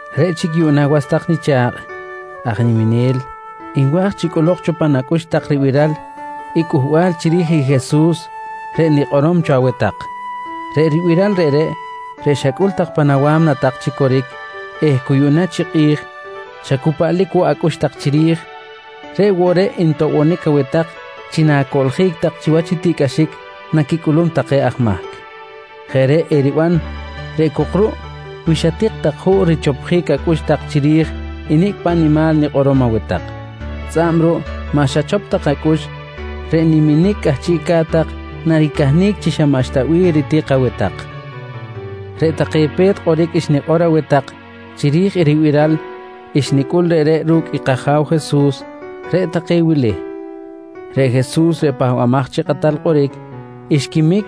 Reꞌ chic yuꞌna was tak nicha̱kꞌ aj niminel nwa̱j chi cꞌolok cho pan acꞌux tak ribiral i cꞌuhbal chiri̱j i Jesus reꞌ nikꞌorom cho aweh tak. Reꞌ ribiral reꞌreꞌ, reꞌ xacꞌul tak pan awa̱mna tak chi coric eh cu yuꞌna chi kꞌi̱j xa cu paꞌlic woꞌ acꞌux tak chiri̱j, reꞌ woꞌ reꞌ ntoꞌbonic aweh tak chi na̱coꞌljic tak chiwach i tiꞌcꞌaxic naquicꞌulum take aj mahc. Jeꞌ reꞌ eriban reꞌ cok ruꞌ wi xatik tak juꞌ richopjic acꞌux tak chiri̱j i nicꞌ paꞌ nimal nikꞌorom aweh tak. Tzꞌa̱b ruꞌ maꞌ xachop tak acꞌux, reꞌ niminic cꞌahchiꞌca̱t tak naricahnic chi xa maꞌxta bih ritik aweh tak. Reꞌ take pe̱t kꞌoric xnikꞌor aweh tak chiri̱j i ribiral xnicꞌul reꞌreꞌ ru̱cꞌ i kAja̱w Jesus, reꞌ take wili: Reꞌ Jesus reꞌ Pahbamaj chi Kꞌatal Kꞌoric, xquimic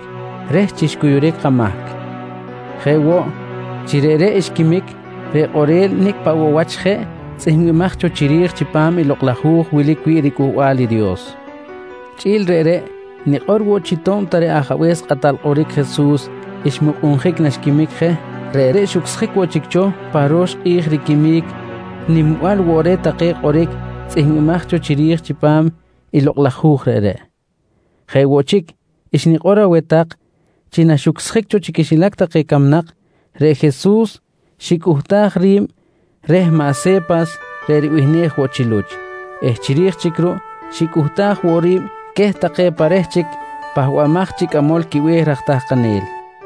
reh chi xcuyuric kamahc. Jeꞌ woꞌ, chi reꞌreꞌ xquimic reꞌ kꞌorel nicꞌ paꞌ woꞌ wach jeꞌ tzꞌihmbimaj cho chiri̱j chipam i Lokꞌ laj Hu̱j wilic wi̱ꞌ riCꞌuhbal i Dios. Chꞌi̱l reꞌreꞌ, nikꞌor woꞌ chi to̱b ta reꞌ Ajabe̱s kꞌatal kꞌoric Jesus xmukꞌunjic naxquimic je, reꞌreꞌ xucsjic woꞌ chic cho pa ro̱x kꞌi̱j riquimic nimbal woꞌ take reh kꞌoric tzꞌihmbimaj cho chiri̱j chipam i lokꞌ laj hu̱j reꞌreꞌ. Jeꞌ woꞌ chic xnikꞌor aweh tak chi naxucsjic cho chi quixilac camnak, reꞌ Jesus xicꞌuhtaj ri̱b reh maꞌ Se̱pas reꞌ ribihnej woꞌ chi Luch eh chiri̱j chic ruꞌ xicꞌuhtaj woꞌ ri̱b queh take pa reh chic pahbamaj chi cꞌamol quibe̱h raj tahkanel.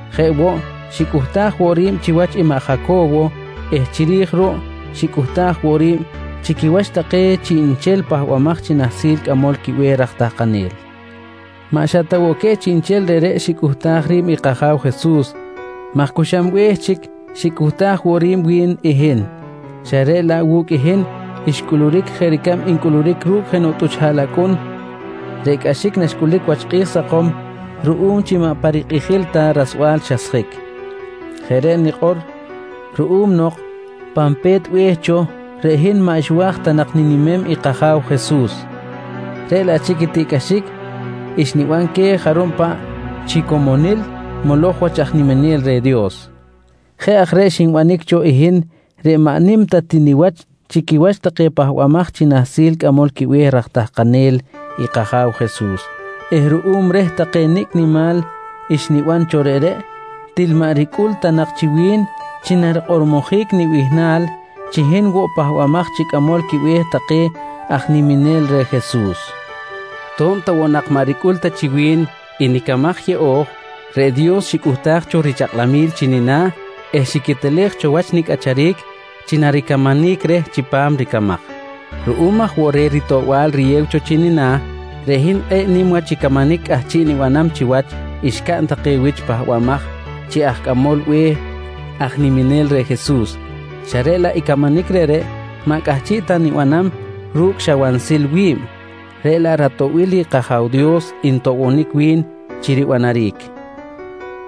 Jeꞌ woꞌ xicꞌuhtaj woꞌ ri̱b chiwach i maꞌ Jaco̱wo eh chiri̱j ruꞌ xicꞌuhtaj woꞌ ri̱b chi quiwach take chiꞌnchel pahbamaj chi nahsil cꞌamol quibe̱h raj tahkanel. Maꞌ xa ta woꞌ queh take chiꞌnchel reꞌreꞌ xicꞌuhtaj ri̱b i kAja̱w Jesus maj cu xam be̱h chic xicꞌuhtaj woꞌ ri̱b wi̱n i hin, xa reꞌ laꞌ wu̱cꞌ i hin xcꞌuluric jeꞌ ricab ncꞌuluric ru̱cꞌ jenoꞌ tꞌuch haꞌlacꞌun reꞌ cꞌaxic naxcꞌulic wach kꞌi̱j sakom ruꞌum chi maꞌ pa rikꞌijil ta rasbal xasjic. Jeꞌ reꞌ nikꞌor ruꞌum nok pan pe̱t be̱h cho, reꞌ hin maꞌ xwa̱j ta nak ninimem i kAja̱w Jesus reꞌ laꞌ chic i tiꞌcꞌaxic xniban queh jarub paꞌ chi comonil moloj wach aj niminel reh Dios. Jeꞌ aj reꞌ xinbanic cho i hin reꞌ maꞌ nim ta ti niwach chi quiwach take pahbamaj chi nahsil cꞌamol quibe̱h raj tahkanel i kAja̱w Jesus eh ruꞌum reh take nicꞌ nimal xniban cho reꞌreꞌ, til maꞌ ricꞌul ta nak chi wi̱n chi narikꞌormojic nibihnal chi hin woꞌ pahbamaj chi cꞌamol quibe̱h take aj niminel reh Jesus. To̱b ta woꞌ nak maꞌ ricꞌul ta chi wi̱n i nicamaj yeꞌo̱j, reꞌ Dios xicꞌuhtaj cho richakꞌlamil chi nina̱ eh xiquetelej cho wach nicꞌacharic chi naricamanic reh chipam ricamaj. Ruꞌum aj woꞌ reh ritoꞌbal riyew cho chi nina̱, reꞌ hin kꞌe̱ꞌ nim wach i camanic cꞌahchiꞌ nibanam chiwach xcaꞌn take wich pahbamaj chi aj cꞌamol be̱h aj niminel reh Jesus, xa reꞌ laꞌ i camanic reꞌreꞌ maꞌ cꞌahchiꞌ ta nibanam ru̱cꞌ xa wansil wi̱b, reꞌ laꞌ ratoꞌbil i kAja̱w Dios ntoꞌbonic wi̱n chi ribanaric.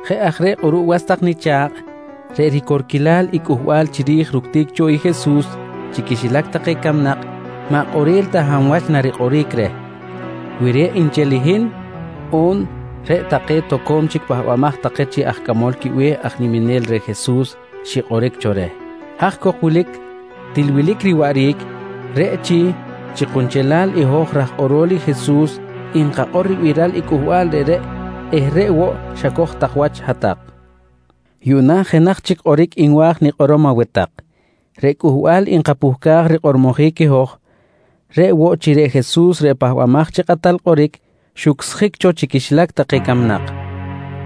Jeꞌ aj reꞌ kꞌuruꞌ was tak nicha̱kꞌ, reꞌ ricorquilal i cꞌuhbal chiri̱j ructic cho i Jesus chi quixilac take camnak maꞌ kꞌorel ta hab wach narikꞌoric reh, wi reꞌ nchel i hin on reꞌ take cho pahbamaj take chi aj cꞌamol quibe̱h aj niminel reh Jesus xikꞌoric cho reh. Haj cok wilic til wilic riwaꞌric, reꞌ chi, chi kunchelal i hoj raj kꞌorol i Jesus nkakꞌor ribiral i cꞌuhbal reꞌreꞌ eh reꞌ woꞌ xacoj tak wach hat-tak. Yuꞌna jenaj chic kꞌoric nwa̱j nikꞌorom aweh tak: Reꞌ cꞌuhbal nkapuhcaj rikꞌormojic i hoj, reꞌ woꞌ chi reꞌ Jesus reꞌ Pahbamaj chi Kꞌatal Kꞌoric xucsjic cho chi quixilac take camnak.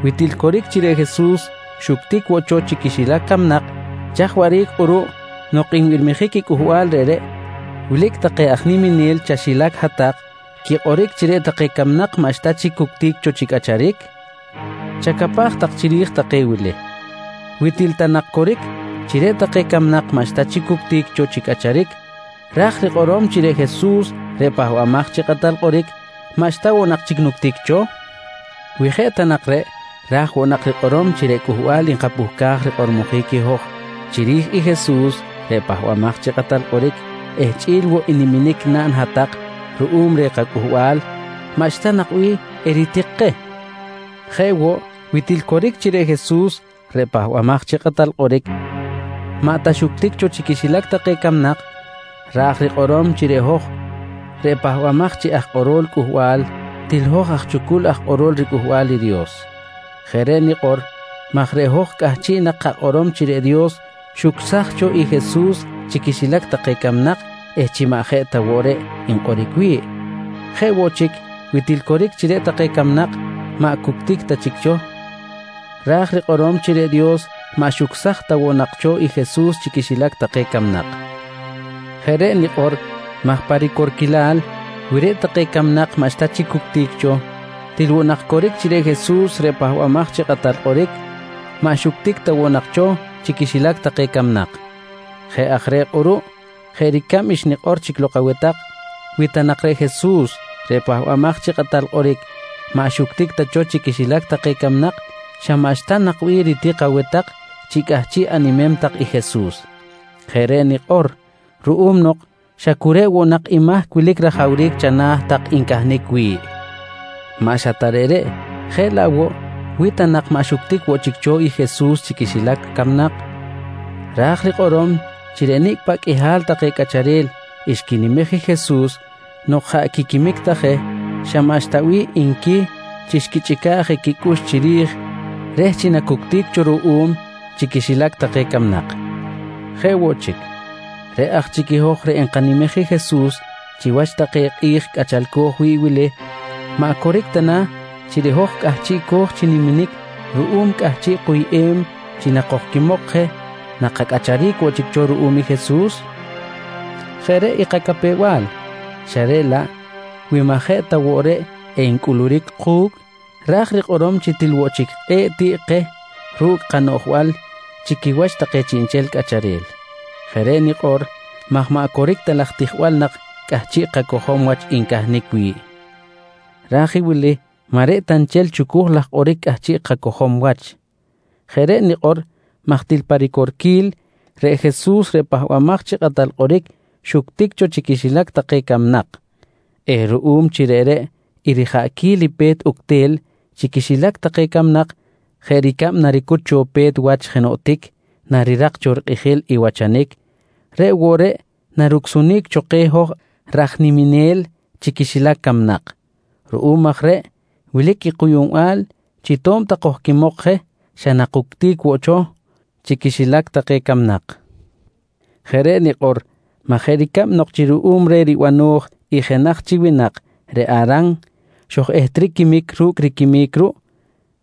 Wi til coric chi reꞌ Jesus xuctic woꞌ cho chi quixilac camnak, chaj waꞌric kꞌuruꞌ nok nbirmijic i cꞌuhbal reꞌreꞌ wilic take aj niminel chaxilac hat-tak quikꞌoric chi reꞌ take camnak maꞌxta chic cuctic cho chi cꞌacharic? Chacapaj tak chiri̱j take wili: Wi til ta nak coric chi reꞌ take camnak maꞌxta chic cuctic cho chi cꞌacharic, ra̱j rikꞌorom chi reꞌ Jesus reꞌ Pahbamaj chi Kꞌatal Kꞌoric maꞌxta woꞌ nak chic nuctic cho? Wi jeꞌ ta nak reꞌ, ra̱j woꞌ nak rikꞌorom chi reꞌ cꞌuhbal nkapuhcaj rikꞌormojic i hoj chiri̱j i Jesus reꞌ Pahbamaj chi Kꞌatal Kꞌoric eh chꞌi̱l woꞌ i niminic naꞌn hat-tak ruꞌum reh kacꞌuhbal, xa maꞌxta nak bih eritik keh. Jeꞌ woꞌ, wi til coric chi reꞌ Jesus reꞌ Pahbamaj chi Kꞌatal Kꞌoric, maꞌ ta xuctic cho chi quixilac take camnak, raj rikꞌorom chi reꞌ hoj reꞌ pahbamaj chi aj kꞌorol cꞌuhbal til hoj aj chucul aj kꞌorol riCꞌuhbal i Dios. Jeꞌ reꞌ nikꞌor maj reꞌ hoj cꞌahchiꞌ nak kakꞌorom chi reꞌ Dios xucsaj cho i Jesus chi quixilac take camnak eh chi maꞌ jeꞌ ta woꞌ reꞌ nkꞌoric wi̱ꞌ. Jeꞌ woꞌ chic, wi til coric chi reꞌ take camnak maꞌ cuctic ta chic cho, ra̱j rikꞌorom chi reꞌ Dios maꞌ xucsaj ta woꞌ nak cho i Jesus chi quixilac take camnak. Jeꞌ reꞌ nikꞌor maj pa ricorquilal wi reꞌ take camnak maꞌxta chic cuctic cho, til woꞌ nak coric chi reꞌ Jesus reꞌ Pahbamaj chi Kꞌatal Kꞌoric maꞌ xuctic ta woꞌ nak cho chi quixilac take camnak. Jeꞌ aj reꞌ kꞌuruꞌ jeꞌ ricab xnikꞌor chic lok aweh tak, wi ta nak reꞌ Jesus reꞌ Pahbamaj chi Kꞌatal Kꞌoric maꞌ xuctic ta cho chi quixilac take camnak, xa maꞌxta nak bih ritik aweh tak chi cꞌahchiꞌ animem tak i Jesus. Jeꞌ reꞌ nikꞌor ruꞌum nok xa cu reꞌ woꞌ nak i mahc wilic rajawric chana̱ tak ncahnic wi̱ꞌ. Maꞌ xa ta reꞌreꞌ, jeꞌ laꞌ woꞌ wi ta nak maꞌ xuctic woꞌ chic cho i Jesus chi quixilac camnak, ra̱j rikꞌorom chi reꞌ nicꞌ paꞌ qꞌuihal take cꞌacharel xquinimej i Jesus nok jaꞌ quiquimic ta je, xa maꞌxta bih nqui chi xquichꞌica̱ꞌ je quicꞌux chiri̱j reh chi nacuctic cho ruꞌum chi quixilac take camnak. Jeꞌ woꞌ chic, reꞌ aj chic i hoj reꞌ nkanimej i Jesus chiwach take kꞌi̱j cꞌachalco̱j wi̱ꞌ wili, maꞌ coric ta na chi reꞌ hoj cꞌahchiꞌco̱j chi niminic ruꞌum cꞌahchiꞌ kuyꞌem chi nakojquimok je nakacꞌacharic woꞌ chic cho ruꞌum i Jesus? Jeꞌ reꞌ i kacapew-bal xa reꞌ laꞌ wi maꞌ jeꞌ ta woꞌ reꞌ encꞌuluric ku̱cꞌ, ra̱j rikꞌorom chi til woꞌ chic kꞌe̱ꞌ tiꞌ keh ru̱cꞌ kanoꞌjbal chi quiwach take chiꞌnchel cꞌacharel. Jeꞌ reꞌ nikꞌor maj maꞌ coric ta laj tijbal nak cꞌahchiꞌ kacojom wach ncahnic wi̱ꞌ. Raj i wili maꞌ reꞌ ta nchel chucuj laj kꞌoric cꞌahchiꞌ kacojom wach. Jeꞌ reꞌ nikꞌor maj til pa ricorquil, reꞌ Jesus reꞌ Pahbamaj chi Kꞌatal Kꞌoric xuctic cho chi quixilac take camnak eh ruꞌum chi reꞌreꞌ i rijaꞌquil i pe̱t uctel chi quixilac take camnak jeꞌ ricab naricut cho pe̱t wach jenoꞌ tic narirak cho rikꞌijil i wachanic, reꞌ woꞌ reꞌ narucsunic cho keh hoj raj niminel chi quixilac camnak. Ruꞌum aj reꞌ wilic i kuyuꞌnbal chi to̱b ta kojquimok je xa nakuctic woꞌ cho chi quixilac take camnak. Jeꞌ reꞌ nikꞌor maj jeꞌ ricab nok chi ruꞌum reh ribano̱j i jenaj chi winak reꞌ Aran xoj-ehtric quimic ru̱cꞌ riquimic ruꞌ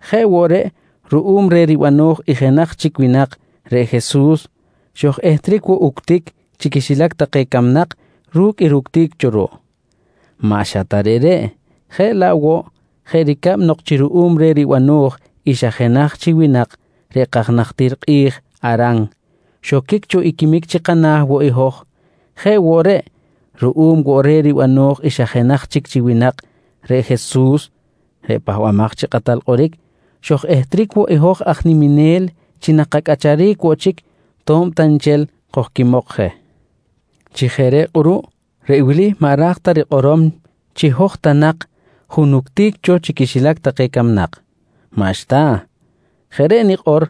jeꞌ woꞌ reꞌ ruꞌum reh ribano̱j i jenaj chic winak reꞌ Jesus xoj-ehtric woꞌ uctic chi quixilac take camnak ru̱cꞌ i ructic cho ruꞌ. Maꞌ xa ta reꞌreꞌ, jeꞌ laꞌ woꞌ jeꞌ ricab nok chi ruꞌum reh ribano̱j i xa jenaj chi winak reꞌ kaj najtir kꞌi̱j Aran xoquic cho i quimic chi kana̱ woꞌ i hoj, jeꞌ woꞌ reꞌ, ruꞌum woꞌ reh ribano̱j i xa jenaj chic chi winak reꞌ Jesus reꞌ Pahbamaj chi Kꞌatal Kꞌoric xoj-ehtric woꞌ i hoj aj niminel chi nakacꞌacharic woꞌ chic to̱b ta nchel kojquimok je. Chi jeꞌ reꞌ kꞌuruꞌ, reꞌ wili maꞌ ra̱j ta rikꞌorom chi hoj ta nak junuctic cho chi quixilac camnak. Maꞌxta. Jeꞌ reꞌ nikꞌor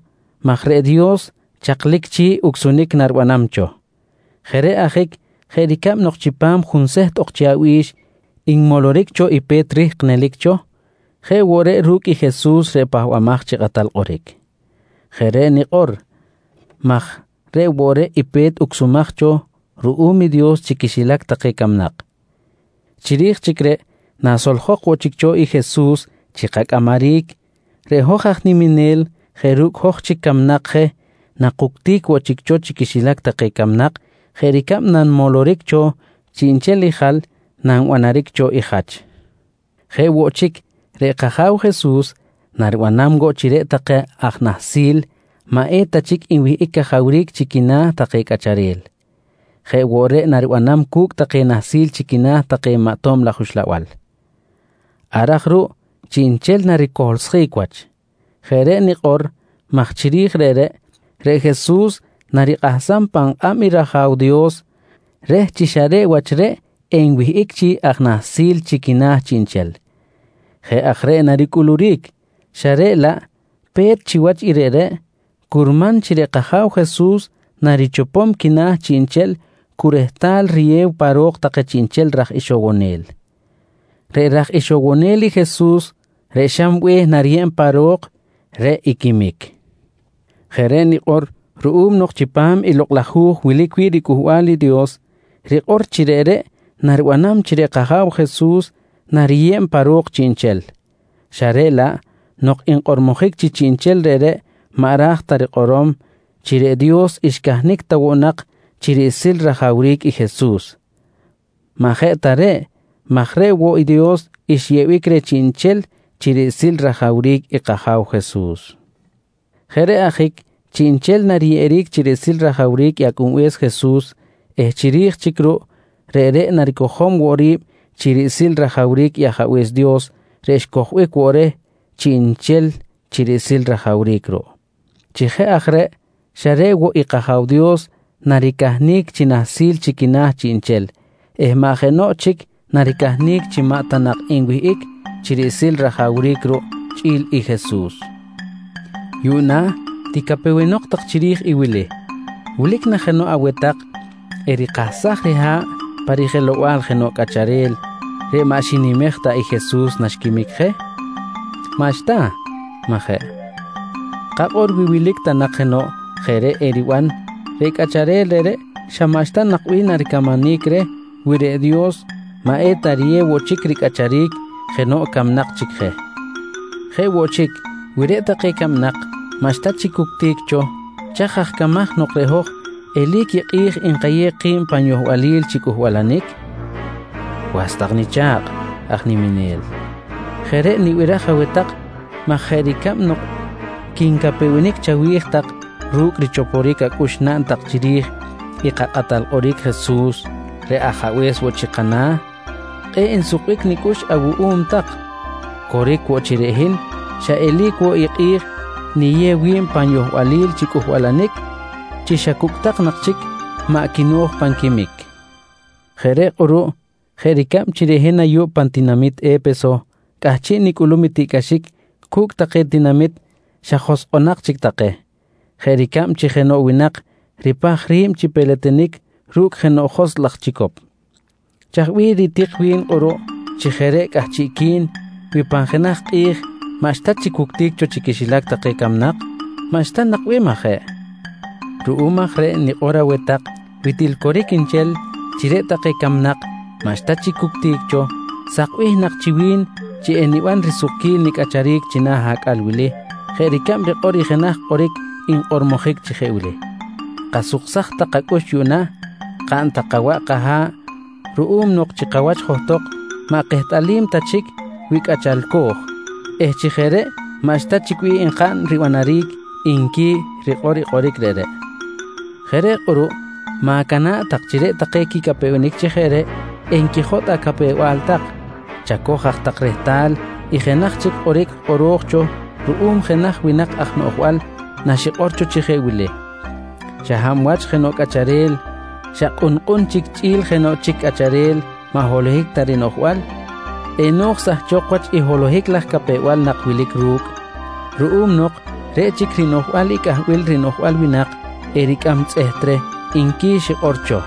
maj reꞌ Dios chaklic chi̱ꞌ ucsunic naribanam cho. Jeꞌ reꞌ ajic jeꞌ ricab nok chipam junseht ok chi abi̱x nmoloric cho i pe̱t rihk nelic cho, jeꞌ woꞌ reꞌ ru̱cꞌ i Jesus reꞌ Pahbamaj chi Kꞌatal Kꞌoric. Jeꞌ reꞌ nikꞌor maj reꞌ woꞌ reꞌ i pe̱t ucsumaj cho ruꞌum i Dios chi quixilac take camnak. Chiri̱j chic reꞌ nasoljok woꞌ chic cho i Jesus chi kacꞌamaric, reꞌ hoj aj niminel jeꞌ ru̱cꞌ hoj chic camnak je nakuctic woꞌ chic cho chi quixilac take camnak jeꞌ ricab nanmoloric cho chiꞌnchel i jal nanbanaric cho i jach. Jeꞌ woꞌ chic reꞌ kAja̱w Jesus naribanam woꞌ chi reꞌ take aj nahsil maꞌeta chic nwihꞌic cajawric chi quina̱ take cꞌacharel, jeꞌ woꞌ reꞌ naribanam cu̱cꞌ take nahsil chi quina̱ take maꞌ tob laj uxlabal. Ar aj ruꞌ chiꞌnchel naricohlsjic wach. Jeꞌ reꞌ nikꞌor maj chiri̱j reꞌreꞌ, reꞌ Jesus narikꞌahsam pan kꞌab i rAja̱w Dios reh chi xa reꞌ wach reꞌ enwihꞌic chi aj nahsil chi quina̱ chiꞌnchel. Jeꞌ aj reꞌ naricꞌuluric xa reꞌ laꞌ pe̱t chiwach i reꞌreꞌ, curman chi reꞌ kAja̱w Jesus narichopom quina̱ chiꞌnchel cu rehtal riyew pa ro̱k take chiꞌnchel raj ixowonel. Reꞌ raj ixowonel i Jesus reꞌ xam be̱h nariyeb pa ro̱k, reꞌ i quimic. Jeꞌ reꞌ nikꞌor ruꞌum nok chipam i Lokꞌ laj Hu̱j wilic wi̱ꞌ riCꞌuhbal i Dios rikꞌor chi reꞌreꞌ naribanam chi reꞌ kAja̱w Jesus nariyeb pa ro̱k chiꞌnchel. Xa reꞌ laꞌ nok nkꞌormojic chi chiꞌnchel reꞌreꞌ maꞌ ra̱j ta rikꞌorom chi reꞌ Dios xcahnic ta woꞌ nak chi riꞌsil rajawric i Jesus. Maꞌ jeꞌ ta reꞌ maj reꞌ woꞌ i Dios xyeꞌbic reh chiꞌnchel chi riꞌsil rajawric i kAja̱w Jesus. Jeꞌ reꞌ ajic chiꞌnchel nariyeꞌeric chi riꞌsil rajawric i Acꞌunbe̱s Jesus eh chiri̱j chic ruꞌ reꞌreꞌ naricojom woꞌ ri̱b chi riꞌsil rajawric i Ajabe̱s Dios reꞌ xcojbic woꞌ reh chiꞌnchel chi riꞌsil rajawric ruꞌ. Chi jeꞌ aj reꞌ xa reꞌ woꞌ i kAja̱w Dios naricahnic chi nahsil chi quina̱ chiꞌnchel eh maꞌ jenoꞌ chic naricahnic chi maꞌ ta nak enwihꞌic chi riꞌsil rajawric ruꞌ chꞌi̱l i Jesus. Yuꞌna ticapewenok tak chiri̱j i wili: Wilic na jenoꞌ aweh tak erikahsaj riha̱ꞌ pa rijelow-bal jenoꞌ cꞌacharel reꞌ maꞌ xinimej ta i Jesus naxquimic je? Maꞌxta, majeꞌ? Kakꞌor wi wilic ta nak jenoꞌ jeꞌ reꞌ eriban, reꞌ cꞌacharel reꞌreꞌ xa maꞌxta nak bih naricamanic reh wi reꞌ Dios maꞌ eta riyew woꞌ chic ricꞌacharic jenoꞌ camnak chic je. Jeꞌ woꞌ chic, wi reꞌ take camnak maꞌxta chic cuctic cho, chaj aj camaj nok reꞌ hoj eli̱c i kꞌi̱j nkayew ki̱b pan yohbalil chi cꞌuhbalanic? Was tak nicha̱kꞌ aj niminel, jeꞌ reꞌ nibiraj aweh tak maj jeꞌ ricab nok quincapewenic chawi̱j tak ru̱cꞌ richoporic acꞌux naꞌn tak chiri̱j i kaKꞌatal Kꞌoric Jesus reꞌ Ajabe̱s woꞌ chi kana̱, kꞌe̱ꞌ nsukbic nicꞌux awuꞌum tak, coric woꞌ chi reꞌ hin xa eli̱c woꞌ i kꞌi̱j niyew wi̱b pan yohbalil chi cꞌuhbalanic chi xa cucꞌtak nak chic maꞌ quino̱j pan quimic. Jeꞌ reꞌ kꞌuruꞌ jeꞌ ricab chi reꞌ hin ayuꞌ pan tinamit E̱peso cꞌahchiꞌ nicꞌulum tiꞌcꞌaxic cu̱cꞌ take tinamit xa joskꞌonak chic take, jeꞌ ricab chi jenoꞌ winak ripaj ri̱b chi peletenic ru̱cꞌ jenoꞌ joskꞌ laj chicop. Chaj bih ritik wi̱n kꞌuruꞌ chi jeꞌ reꞌ cꞌahchiꞌqui̱n wi pan jenaj kꞌi̱j maꞌxta chic wuctic cho chi quixilac take camnak? Maꞌxta nak bih, majeꞌ? Ruꞌum aj reꞌ nikꞌor aweh tak wi til coric nchel chi reꞌ take camnak maꞌxta chic cuctic cho, sakbih nak chi wi̱n chi eniban risukquil nicꞌacharic china̱ acꞌal wili jeꞌ ricab rikꞌor i jenaj kꞌoric nkꞌormojic chi jeꞌ wili: “Kasuksaj tak kacꞌux yuꞌna, kaꞌn tak kawaꞌ kaha̱ꞌ ruꞌum nok chi kawach johtok maꞌ kehtꞌalim ta chic wi cꞌachalco̱j eh chi jeꞌ reꞌ maꞌxta chic bih enkaꞌn ribanaric, nqui i rikꞌor i kꞌoric reꞌreꞌ. Jeꞌ reꞌ kꞌuruꞌ ma̱cana̱ꞌ tak chi reꞌ take quicapewenic chi jeꞌ reꞌ enquijotꞌ acapew-bal tak, chacoj aj tak rehtal i jenaj chic kꞌoric kꞌoro̱j cho ruꞌum jenaj winak aj noꞌjbal naxikꞌor cho chi jeꞌ wili: “Xa hab wach jenoꞌ cꞌacharel xa kꞌunkꞌun chic chꞌi̱l jenoꞌ chic cꞌacharel maꞌ holohic ta rinoꞌjbal, eno̱j sahchok wach i holohic laj capew-bal nak wilic ru̱cꞌ ruꞌum nok reꞌ chic rinoꞌjbal i cꞌahbil rinoꞌjbal winak ericꞌam tzꞌeht reh, nqui xikꞌor cho.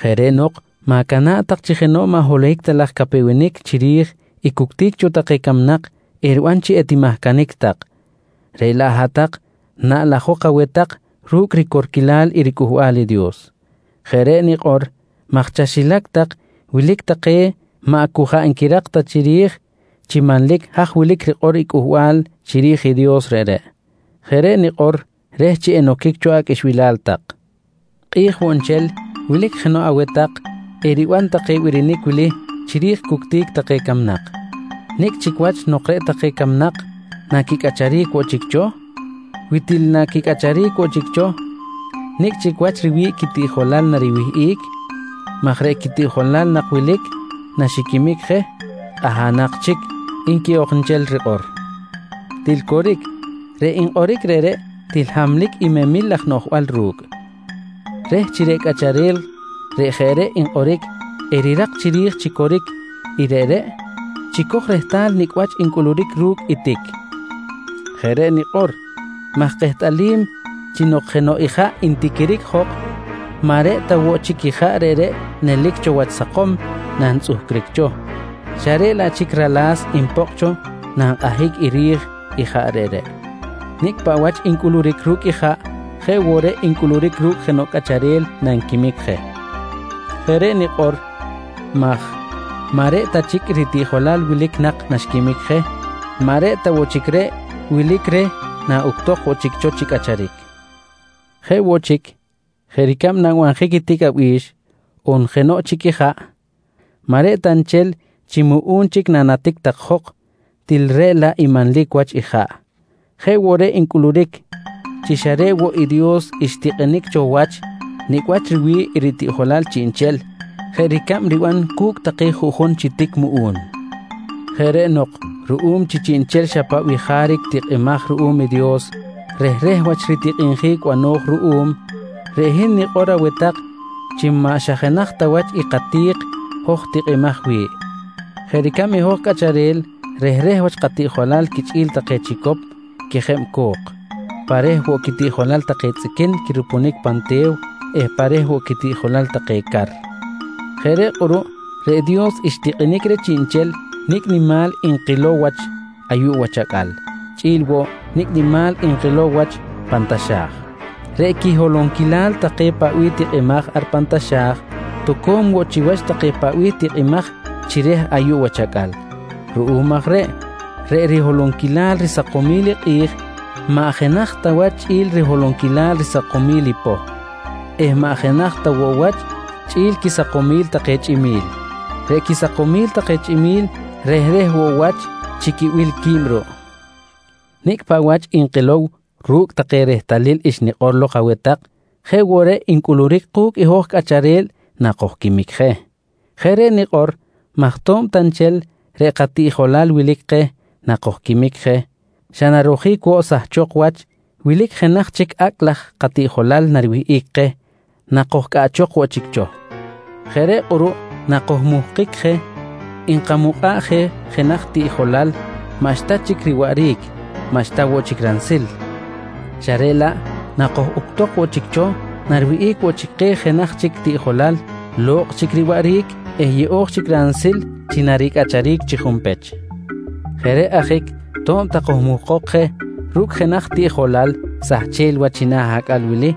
Jeꞌ reꞌ nok ma̱cana̱ꞌ tak chi jenoꞌ maꞌ holohic laj capewenic chiri̱j i cuctic cho take camnak eriban chi etimahcanic tak, reꞌ laꞌ hat-tak naꞌlajok aweh tak ru̱cꞌ ricorquilal riCꞌuhbal i Dios. Jeꞌ reꞌ nikꞌor maj chaxilac tak wilic take maꞌ jaꞌ cu nquirak ta chiri̱j chi manlic haj wilic rikꞌor i cꞌuhbal chiri̱j i Dios reꞌreꞌ. Jeꞌ reꞌ nikꞌor reh chi enoquic cho aqꞌuixbilal tak. Kꞌi̱j woꞌ nchel wilic jenoꞌ aweh tak eriban take birinic wili chiri̱j cuctic take camnak: «Nicꞌ chic wach nok reꞌ take camnak naquicꞌacharic woꞌ chic cho? Wi til naquicꞌacharic woꞌ chic cho, nicꞌ chic wach riwi̱ꞌ quitiꞌjolal nariwihꞌic? Maj reꞌ quitiꞌjolal nak wilic naxiquimic je kꞌahanak chic, nqui ok nchel rikꞌor. Til coric, reꞌ nkꞌoric reꞌreꞌ til hamlic i memil laj noꞌjbal ru̱cꞌ. Reh chi reꞌ cꞌacharel reꞌ jeꞌ reꞌ nkꞌoric erirak chiri̱j chi coric i reꞌreꞌ, chicoj rehtal nicꞌ wach ncꞌuluric ru̱cꞌ i tic. Jeꞌ reꞌ nikꞌor maj kehtꞌalim chi nok jenoꞌ ijaꞌ ntiquiric jok, maꞌ reꞌ ta woꞌ chic ijaꞌ reꞌreꞌ nelic cho wach sakom nantzꞌuhcric cho, xa reꞌ laꞌ chic rala̱s npokꞌ cho na nkꞌahic i ri̱j ijaꞌ reꞌreꞌ. Nicꞌ paꞌ wach ncꞌuluric ru̱cꞌ ijaꞌ jeꞌ woꞌ reꞌ ncꞌuluric ru̱cꞌ jenoꞌ cꞌacharel nanquimic je. Jeꞌ reꞌ nikꞌor maj maꞌ reꞌ ta chic i ritiꞌjolal wilic nak naxquimic je, maꞌ reꞌ ta woꞌ chic reꞌ wilic reh naꞌuctok woꞌ chic cho chi cꞌacharic. Jeꞌ woꞌ chic, jeꞌ ricab nanbanjic i tic abi̱x on jenoꞌ chic i jaꞌ, maꞌ reꞌ ta nchel chi muꞌu̱n chic nanatic tak jok til reꞌ laꞌ i manlic wach ijaꞌ jeꞌ woꞌ reꞌ ncꞌuluric chi xa reꞌ woꞌ i Dios xtikꞌinic cho wach nicꞌ wach riwi̱ꞌ i ritiꞌjolal chiꞌnchel jeꞌ ricab riban cu̱cꞌ take juꞌjun chi tic muꞌu̱n. Jeꞌ reꞌ nok ruꞌum chi chiꞌnchel xa paꞌ bih jaric tikꞌimaj ruꞌum i Dios rehreh wach ritikꞌinjic bano̱j ruꞌum, reꞌ hin nikꞌor aweh tak chi maꞌ xa jenaj ta wach i kati̱k hoj tikꞌimaj wi̱ꞌ. Jeꞌ ricab i hoj cꞌacharel rehreh wach katiꞌjolal quichꞌi̱l take chicop quejeb co̱k, pa reh woꞌ quitiꞌjolal take tzꞌiquin quirupunic pan te̱w eh pa reh woꞌ quitiꞌjolal take car. Jeꞌ reꞌ kꞌuruꞌ reꞌ Dios xtikꞌinic reh chiꞌnchel nicꞌ nimal nkilow wach ayuꞌ wach acꞌal chꞌi̱l woꞌ nicꞌ nimal nkilow wach pan taxa̱j. Reꞌ quiholonquilal take paꞌ bih tikꞌimaj ar pan taxa̱j toco̱m woꞌ chiwach take paꞌ bih tikꞌimaj chi reh ayuꞌ wach acꞌal. Ruꞌum aj reꞌ, reꞌ riholonquilal risakomil i kꞌi̱j maꞌ jenaj ta wach chꞌi̱l riholonquil risakomil i poh eh maꞌ jenaj ta woꞌ wach chꞌi̱l quisakomil take chꞌimi̱l. Reꞌ quisakomil take chꞌimi̱l rehreh woꞌ wach chi quibil qui̱b ruꞌ. Nicꞌ paꞌ wach nkilow ru̱cꞌ take rehtalil xnikꞌor lok aweh tak jeꞌ woꞌ reꞌ ncꞌuluric ku̱cꞌ i hoj cꞌacharel nakojquimic je. Jeꞌ reꞌ nikꞌor maj to̱b ta nchel reꞌ katiꞌjolal wilic keh nakojquimic je xa narojic woꞌ sahchok wach, wilic jenaj chic acꞌ laj katiꞌjolal nariwihꞌic keh nakojcꞌaꞌchok woꞌ chic cho. Jeꞌ reꞌ kꞌuruꞌ nakojmuhkic je nkamukꞌa̱ꞌ je jenaj tiꞌjolal maꞌxta chic riwaꞌric maꞌxta woꞌ chic ransil, xa reꞌ laꞌ nakojuctok woꞌ chic cho nariwihꞌic woꞌ chic keh jenaj chic tiꞌjolal lo̱kꞌ chic riwaꞌric eh yeꞌo̱j chic ransil chi naricꞌacharic chi junpech. Jeꞌ reꞌ ajic to̱b ta kojmuhkok je ru̱cꞌ jenaj tiꞌjolal sahchel wach china̱ acꞌal wili,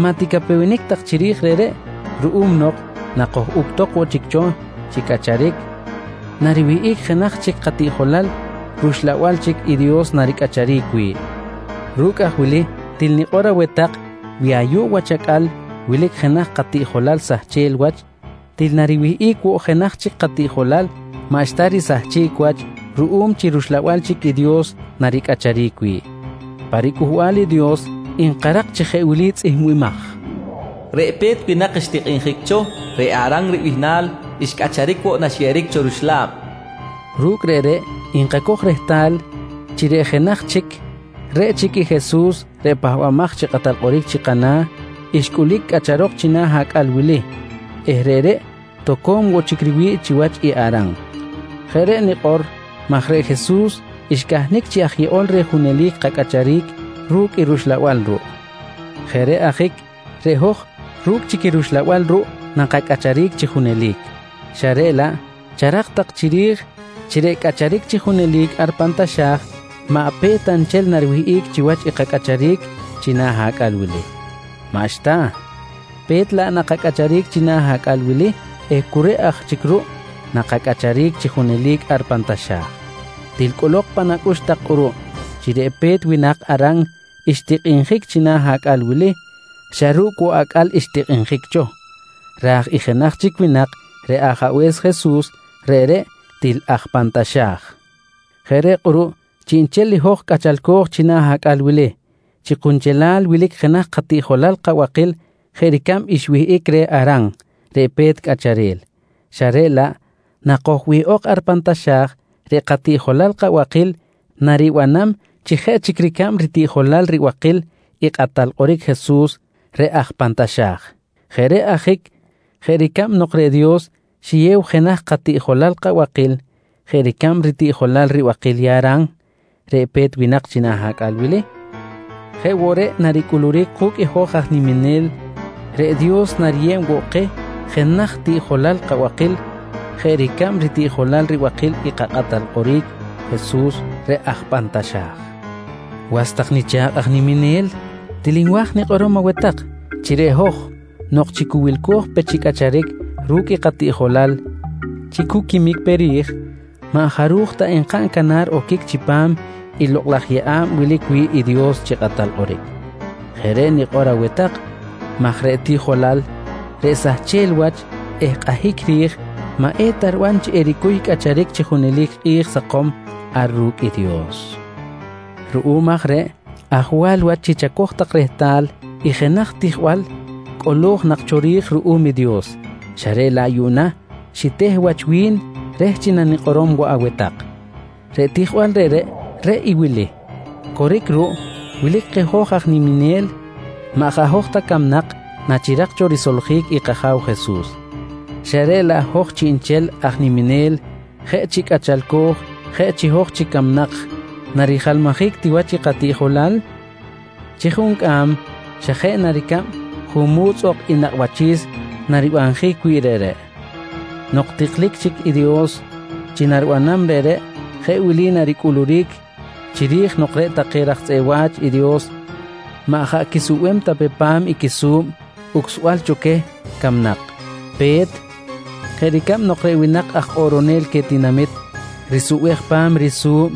maꞌ ticapewenic tak chiri̱j reꞌreꞌ ruꞌum nok nakojuctok woꞌ chic cho chi cꞌacharic nariwihꞌic jenaj chic katiꞌjolal rUxlabal chic i Dios naricꞌacharic wi̱ꞌ. Ru̱cꞌ aj wili til nikꞌor aweh tak wi ayuꞌ wach acꞌal wilic jenaj katiꞌjolal sahchel wach, til nariwihꞌic woꞌ jenaj chic katiꞌjolal maꞌxta risahchic wach ruꞌum chi rUxlabal chic i Dios naricꞌacharic wi̱ꞌ. Pa riCꞌuhbal i Dios nkarak chi jeꞌ wili tzꞌihmbimaj: “Reꞌ pe̱t winak xtikꞌinjic cho, reꞌ Aran ribihnal, xcꞌacharic woꞌ naxyeꞌeric cho ruxla̱b, nqui cꞌuhbal reꞌreꞌ. Ru̱cꞌ reꞌreꞌ nkacoj rehtal chi reꞌ jenaj chic, reꞌ chic i Jesus reꞌ Pahbamaj chi Kꞌatal Kꞌoric chi kana̱, xcꞌulic cꞌacharok china̱ acꞌal wili eh reꞌreꞌ toco̱m woꞌ chic riwi̱ꞌ chiwach i Aran. Jeꞌ reꞌ nikꞌor maj reꞌ Jesus xcahnic chi aj yeꞌol reh junelic kacꞌacharic ru̱cꞌ i rUxlabal ruꞌ. Jeꞌ reꞌ ajic reꞌ hoj ru̱cꞌ chic i rUxlabal ruꞌ nakacꞌacharic chi junelic xa reꞌ laꞌ charak tak chiri̱j chi reꞌ cꞌacharic chi junelic ar pan taxa̱j maꞌ pe̱t ta nchel nariwihꞌic chiwach i kacꞌacharic china̱ acꞌal wili. Maꞌxta, pe̱t laꞌ nakacꞌacharic china̱ acꞌal wili eh cu reꞌ aj chic ruꞌ nakacꞌacharic chi junelic ar pan taxa̱j. Til cꞌolok pan acꞌux tak kꞌuruꞌ chi reꞌ pe̱t winak Aran xtikꞌinjic china̱ acꞌal wili xa ru̱cꞌ woꞌ acꞌal xtikꞌinjic cho, raj i jenaj chic winak reꞌ Ajabe̱s Jesus, reꞌreꞌ til aj pan taxa̱j. Jeꞌ reꞌ kꞌuruꞌ chiꞌnchel i hoj cꞌachalco̱j china̱ acꞌal wili, chi kunchelal wilic jenaj katiꞌjolal kabakil jeꞌ ricab xwihꞌic reh Aran reꞌ pe̱t cꞌacharel, xa reꞌ laꞌ nakojwihꞌok ar pan taxa̱j, reꞌ katiꞌjolal kabakil naribanam chi jeꞌ chic ricab ritiꞌjolal ribakil i Kꞌatal Kꞌoric Jesus reꞌ aj pan taxa̱j. Jeꞌ reꞌ ajic jeꞌ ricab nok reꞌ Dios xiyew jenaj katiꞌjolal kabakil jeꞌ ricab ritiꞌjolal ribakil i Aran reꞌ pe̱t winak china̱ acꞌal wili, jeꞌ woꞌ reꞌ naricꞌuluric ku̱cꞌ i hoj aj niminel reꞌ Dios nariyeb woꞌ keh jenaj tiꞌjolal bakil jeꞌ ricab ritiꞌjolal ribakil i kaKꞌatal Kꞌoric Jesus reꞌ aj pan taxa̱j. Was tak nicha̱kꞌ aj niminel, til nwa̱j nikꞌorom aweh tak chi reꞌ hoj nok chi cu wilco̱j pe chi cꞌacharic ru̱cꞌ i katiꞌjolal chi cu quimic pe ri̱j, maꞌ jaruj ta enkaꞌn canar oquic chipam i lokꞌ laj yeꞌa̱b wilic wi̱ꞌ i Dios chi Kꞌatal Kꞌoric. Jeꞌ reꞌ nikꞌor aweh tak maj reꞌ tiꞌjolal reꞌ sahchel wach eh kꞌahic ri̱j maꞌ eta riban chi ericuy cꞌacharic chi junelic kꞌi̱j sakom ar ru̱cꞌ i Dios. Ruꞌum aj reꞌ ajwal wach chi chacoj tak rehtal i jenaj tijbal cꞌolo̱j nak cho ri̱j ruꞌum i Dios xa reꞌ laꞌ yuꞌna xiteh wach wi̱n reh chi nanikꞌorom woꞌ aweh tak. Reꞌ tijbal reꞌreꞌ, reꞌ i wili: Coric ruꞌ, wilic keh hoj aj niminel maꞌ jaꞌ hoj ta camnak nachirak cho risoljic i kAja̱w Jesus, xa reꞌ laꞌ hoj chiꞌnchel aj niminel jeꞌ ru̱cꞌ chi je cꞌachalco̱j chi je hoj chic camnak narijalmajic ti wach i katiꞌjolal chi juncꞌam xa jeꞌ na ricab junmu̱tz ok i nakꞌ wachi̱s naribanjic wi̱ꞌ reꞌreꞌ. Nok tiklic chic i Dios chi naribanam reꞌreꞌ jeꞌ wili naricꞌuluric chiri̱j nok reꞌ take raj tzꞌeꞌ wa̱ch i Dios maꞌ jaꞌ quisubem ta pe pa̱m i quisu̱b ucsbal cho queh camnak: Pe̱t, jeꞌ ricab nok reꞌ winak aj kꞌoꞌronel queh tinamit risubej pa̱m i risu̱b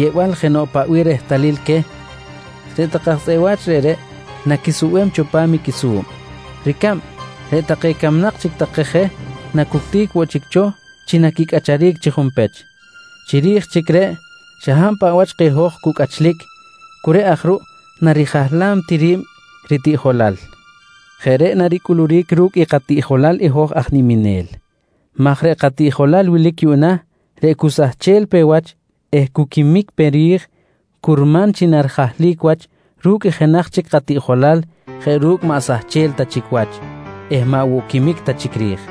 yeꞌbal jenoꞌ paꞌ bih rehtalil queh, reꞌ take aj tzꞌeꞌ wach reꞌreꞌ naquisubem cho pa̱m quisu̱b. Ricab, reꞌ take camnak chic take je nacutic woꞌ chic cho chi naquicꞌacharic chi junpech. Chiri̱j chic reꞌ, xa hab paꞌ wach keh hoj cu cꞌachlic cu reꞌ aj ruꞌ narijahlam ti ri̱b ritiꞌjolal. Jeꞌ reꞌ naricꞌuluric ru̱cꞌ i katiꞌjolal i hoj aj niminel maj reꞌ katiꞌjolal wilic yuꞌna reꞌ cu sahchel pe wach eh cu quimic pe ri̱j, curman chi narijahlic wach ru̱cꞌ i jenaj chic katiꞌjolal jeꞌ ru̱cꞌ maꞌ sahchel ta chic wach eh maꞌ woꞌ quimic ta chic ri̱j.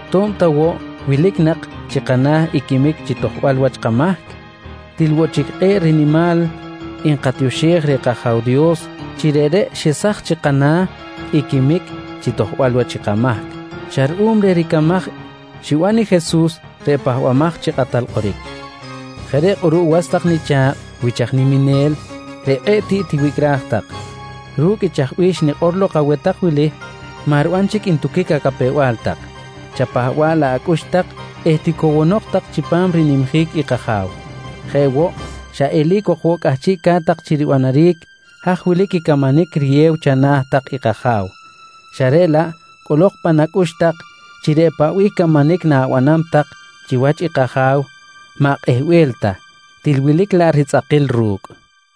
To̱b ta woꞌ wilic nak chi kana̱ i quimic chi tojbal wach kamahc, til woꞌ chic kꞌe̱ꞌ rinimal nkatioxej reh kAja̱w Dios chi reꞌreꞌ xesaj chi kana̱ i quimic chi tojbal wach i kamahc xa ruꞌum reh ricamaj xiban i Jesus reꞌ Pahbamaj chi Kꞌatal Kꞌoric. Jeꞌ reꞌ kꞌuruꞌ was tak nicha̱kꞌ wich aj niminel reꞌ kꞌe̱ꞌ tiꞌ tiwicꞌraj tak, ru̱cꞌ i chaj bih xnikꞌor lok aweh tak wili maꞌ riban chic ntuquic acapew-bal tak, chapahba̱ꞌ laꞌ acꞌux tak eh ticowonok tak chipam rinimjic i kAja̱w. Jeꞌ woꞌ xa eli̱c ok woꞌ cꞌahchiꞌca̱t tak chi ribanaric haj wilic i camanic riyew tak chana̱ i kAja̱w xa reꞌ laꞌ cꞌolok pan acꞌux tak chi reꞌ paꞌ bih camanic na̱banam tak chiwach i kAja̱w maꞌ kꞌehbel ta, til wilic laꞌ ritzꞌakil ru̱cꞌ.